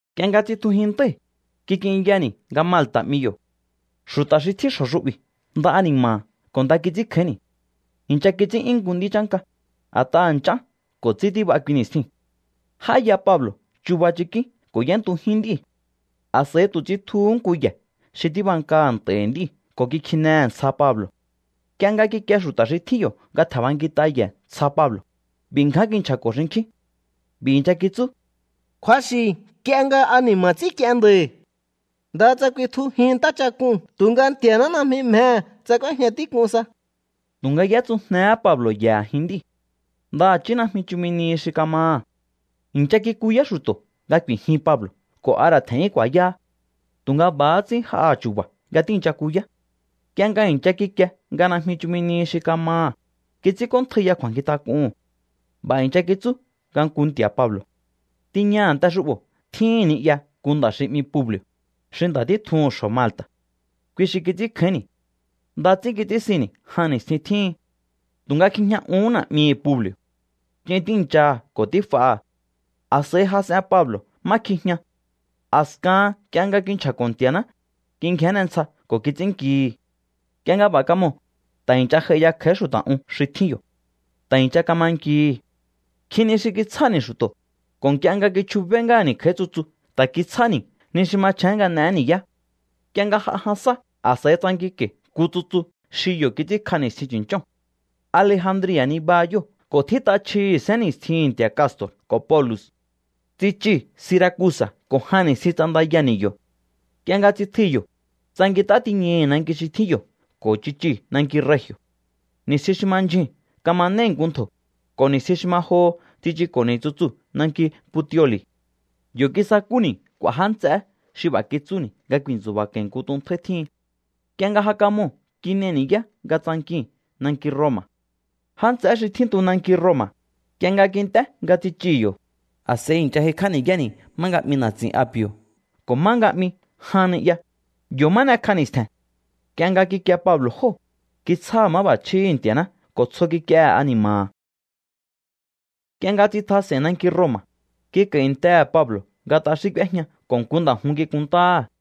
Nk'ie nga tsitjujin ntái̱, kik'inyani̱ nga Malta̱ 'mi yo̱. Xu̱ta̱ xi tjín xjo̱ xu'bi̱ nda ani̱ma̱ha̱ ko̱ nda kits'ínkjáínni̱. I̱ncha kits'ín'yún nku nd'í chánka, a̱t'aha̱ nch'án ko̱ ts'í tíb'a kui ni̱stjiu̱n. J'áya Pablo̱ chuba chikín ko̱ y'éntujín nd'íu̱. A̱s'a̱i tu̱ tsitjuhú nku ye̱ xi tíbankaha̱ nt'a̱i̱hi̱ nd'íu̱ ko̱ kikjinehe̱ ntsja Pablo̱. Nk'ie nga kikie xu̱ta̱ xi tjín yo̱ nga tje̱nb'ankit'a ye̱ ntsja Pablo̱, b'i̱ ngján kinchja̱ko̱ xinkjín. B'i̱ i̱ncha kitsú: —Kju̱axi̱ nk'ie nga ani̱ma̱ ts'ínk'ien nda̱i̱. Ndaha tsa kuitjujin ntáchak'uu̱n tu̱nga Nti̱a̱ná najmi mjehe̱ tsa k'úéjña tík'un sa. Tu̱nga y'étsujnehé Pablo̱ ye̱ a̱jin nd'íu̱. Ndaha̱chí najmi chumi nihi xi kamaha̱. I̱ncha kikuyá xu̱to̱ nga ku̱i̱jin Pablo̱ ko̱ a ra̱ tje̱n'yún ku̱a̱yáha. Tu̱nga b'a̱há ts'ín j'aha chu̱ba̱ nga tíi̱ncha kuya. Nk'ie nga i̱ncha kikie nga najmi chumi nihi xi kamaha̱, kits'ínk'óntjaiya kju̱a̱nkjintak'uhu̱n. B'a̱ i̱ncha kitsú nga nku nti̱a̱ Pablo̱. Tiña a̱nte xu'bo̱ tjíhi̱n ni'ya nku nda̱ xi 'mi Publi̱o̱, xi nda̱ títjuhu̱n xjo̱ Malta̱. Kui xi kits'ínkjáínni̱. Nda ts'ín kits'ínsinni̱ jan ni̱stjin tjíhin. Tu̱nga kjijña uhún na̱'mihi̱ Publi̱o̱. Ch'in tíi̱nchaha ko̱ tíf'aha̱. A̱s'a̱i jas'en Pablo̱ má kjijña. A̱skahan nk'ie nga kinchja̱ko̱ Nti̱a̱ná, kingjénne ntsja ko̱ kits'ínnkihi̱. Nk'ie nga b'a̱ kamoo̱, ta̱ i̱ncha j'ai ya kj'a̱í xu̱ta̱ un xi tjín yo̱. Ta̱ i̱ncha kama nkihi̱. Nkjin ni xi kitsjáni̱ xu̱to̱, ko̱ nk'ie nga kichjubé ngáha̱ni̱ kj'a̱í tsutsu ta̱ kitsjáni̱ ni xi machjén nga n'eé ni̱yá. Nk'ie nga j'a jan sá, a̱s'a̱i tsankinko̱i̱ nku tsutsu xi yo̱ kits'ínkj'a ni̱stjin chu̱nch'óo̱n. Alejandria̱ nibaha yóo̱ ko̱ tjít'a chjihi̱ sénni̱stjihi̱n nti̱a̱ Casto̱r ko̱ Polu̱x. Tsichii̱ Siracusa̱ ko̱ jan ni̱stjin ts'andayani̱ yo̱. Nk'ie nga tsitjui̱ yo̱, tsankint'á tiñai̱ nanki xi tjín yo̱ ko̱ tsichii̱ nanki Regi̱o̱. Ni̱stjin xi ma ndyjuu̱n kamanéi̱ nku ntjo̱, ko̱ ni̱stjin xi ma joho tsichuko̱ni̱ tsutsuu̱ nanki Puteoli̱. Yo̱ kisakúni̱ k'u̱a̱ já nts'eé xi b'a̱ kitsúni̱ nga ku̱i̱ntsu̱ba̱ko̱i̱ nku tuntjáí tjíhin. Nk'ie nga ja kamoo̱ kin'ei̱ ni̱yá nga tsankii̱n nanki Roma̱. Já nts'eé xi tjíntu nanki Roma̱, nk'ie nga kint'é nga tsichii̱ yo̱, a̱s'a̱i i̱ncha j'aikj'á ni̱yáni̱ má nga 'mi Na̱tsi̱n Api̱o̱ ko̱ má nga 'mi Jan Ni'ya, yo̱ má n'ekj'a ni̱stje̱n. Nk'ie nga kikie Pablo̱ jóo̱, kitsjáha̱ máb'a̱chjíhi̱ Nti̱a̱ná ko̱ tsjo kik'iehe̱ ani̱ma̱ha̱. Nk'ie nga tsitjas'e̱i̱n nanki Roma̱, kik'a̱i̱ntehe̱ Pablo̱ nga t'axín k'úéjña ko̱ nku nda̱ jun kikunntáha̱.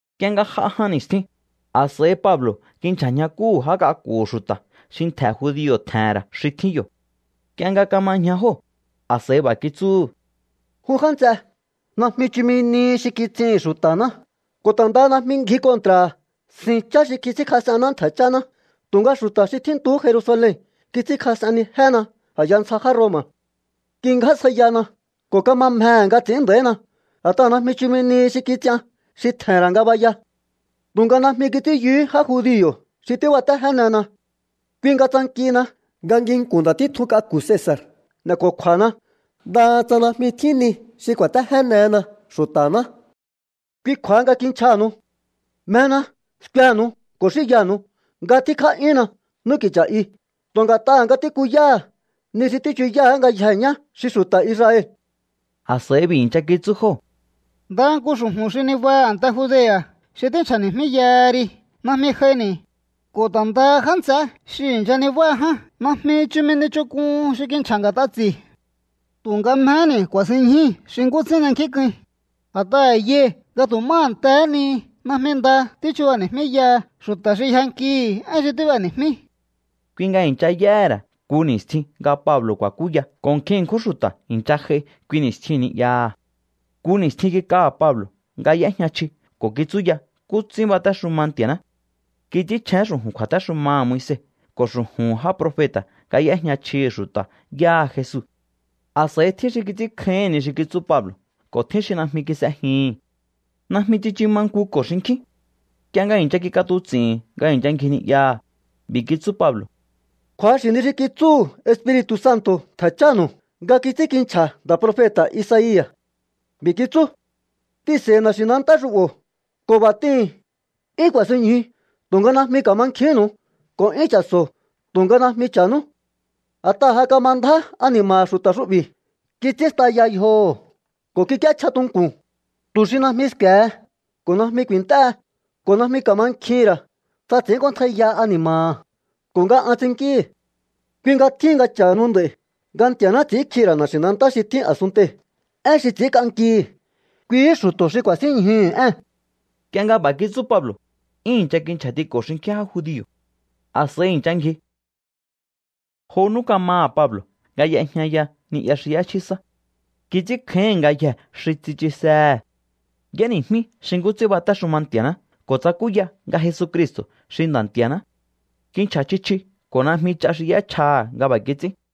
Nk'ie nga j'a jan ni̱stjin, a̱s'a̱i Pablo̱ kinchja̱ ñjakúhu̱ já k'aku̱hu̱ xu̱ta̱ xi ntje̱ judio̱ tje̱he̱n ra̱ xi tjín yo̱. Nk'ie nga kama ñja jóo̱, a̱s'a̱i b'a̱ kitsúhu̱: —Jun já nts'e, najmi chumi nihi xi kits'ihi̱n xu̱ta̱ná ko̱ ta̱ ndaha najmi ngji kontra̱ha̱ sin chá xi kits'ínkjas'enná ntje̱ cháná. Tu̱nga xu̱ta̱ xi tjíntuhú Jerusalen kits'ínkjas'ennijéna a̱ya ntsja já Roma̱. Kingjásjaiyana ko̱ kama mjehe̱ nga ts'i̱ín nda̱ína, a̱t'aha̱ najmi chumi nihi xi kits'ian xi tje̱he̱n ra̱ ngabaya. Tu̱nga najmi kits'ín yuhú já judio̱ xi tíbatéjénena. Kui nga tsankihina nga nginku̱n ndatítjun k'aku̱ Cesa̱r n'e̱ko̱kju̱a̱hana, ndaha tsa najmi tjín ni xi kuatejénehena xu̱ta̱ná. Kui kju̱a̱ha nga kinchjaha̱nu̱u. Mjena skuenu̱u ko̱ xínyanu̱u nga tjínkjá'yúnna n'úki̱cha̱ i tu̱ nga̱t'aha̱ nga tíkuyáha̱ ni xi tíchuyáá ngayjeé ñá xi xu̱ta̱ Israel. A̱s'a̱i b'i̱ i̱ncha kitsú jóo̱: —Ndaha nku xu̱ju̱n xi nibaha a̱nte Judea̱ xi tínchja̱ni̱jmíyaha ri najmi j'aini̱, ko̱ ta̱ ndaha já nts'eé xi i̱ncha nibáha ján najmi chumi ni ch'onk'uhun xi kinchja̱ nga̱t'a ts'i̱. Tu̱nga mjehéni̱ ku̱a̱sinñjúi̱ xi nkú ts'ín n'enkjínk'uin, a̱t'aha̱ yai̱ nga tu̱ má a̱ntehé ni najmi nda tíchubani̱jmíyaha xu̱ta̱ xi yjankihi̱ én xi tíb'eni̱jmí. Kui nga i̱ncha y'éhe̱ ra̱ nku ni̱stjin nga Pablo̱ ku̱a̱kúya ko̱ nkjin ṉkjún xu̱ta̱ i̱ncha j'ai kui ni̱stjiu̱n ni'yaha̱. Nku ni̱stjin kik'aha̱ Pablo̱ nga y'éjña chji ko̱ kitsúya nkú ts'ín batéxuma Nti̱a̱ná. Kits'ínchjén xu̱ju̱n kju̱a̱téxumaha̱ Moise ko̱ xu̱ju̱hu̱n já profeta̱ nga y'éjña chjihi̱ xu̱ta̱ yáha Jesu. A̱s'a̱i tjín xi kits'ínkjáíhi̱n ni xi kitsú Pablo̱ ko̱ tjín xi najmi kis'ejihi̱n. Najmi tsichu ma nkuko̱ xinkjín. Nk'ie nga i̱ncha kik'atuts'i̱hi̱n nga i̱ncha ngji ni'yaha̱, b'i̱ kitsú Pablo̱: —Kju̱axi̱ ni xi kitsúhu̱ Espiri̱tu̱ Santo̱ ntje̱ chánu̱u nga kits'ínkinchja̱ nda̱ profeta̱ Isaia̱. B'i̱ kitsú: T'ihi̱nse̱i̱hi̱ na̱xi̱nantá xu'bo̱ ko̱ b'a̱ t'ihi̱n: 'Yún ku̱a̱sinñju tu̱nga najmi ka̱mankjihínnu̱u, ko̱ 'yún cha̱so̱o tu̱nga najmi cha̱nú. A̱t'aha̱ ja kama ndjá ani̱ma̱ha̱ xu̱ta̱ xu'bi̱, kits'ín staya yjoho̱ ko̱ kik'íéchja tunku̱n, tu̱ xi najmi sku̱e̱he ko̱ najmi ku̱i̱nt'éhe, ko̱ najmi ka̱mankjihi̱n ra̱, tsa ts'i̱ínk'óntjaiya ani̱ma̱ha̱ ko̱ nga an ts'innkíhi̱. ’Kui nga tjíhin nga cha̱hanu nd'a̱i̱ nga Nti̱a̱ná ts'i̱ínkjihi̱ ra̱ na̱xi̱nantá xi tjín a̱sunntei̱ én xi ts'i̱ínk'ankihi̱. Kuihí xu̱to̱ xi ku̱a̱sínñjuhu̱ ée̱n. Nk'ie nga b'a̱ kitsú Pablo̱, 'yún i̱ncha kinchja̱tiko̱ xinkjín já judio̱. A̱s'a̱i i̱ncha ngji. Jo nú kamaha̱ Pablo̱ nga y'ejñaya ni'ya xi y'échjí sá. Kits'ínkjáíhi̱n ngayjee̱ xi tsichusehe̱. Y'éni̱jmí xi nkú ts'ín batéxuma Nti̱a̱ná ko̱ tsakúya nga Jesucristo̱ xi Nda̱ Nti̱a̱ná. Kinchja̱ chji chji ko̱ najmi ch'a xi y'échjaha̱ nga b'a̱ kits'ín.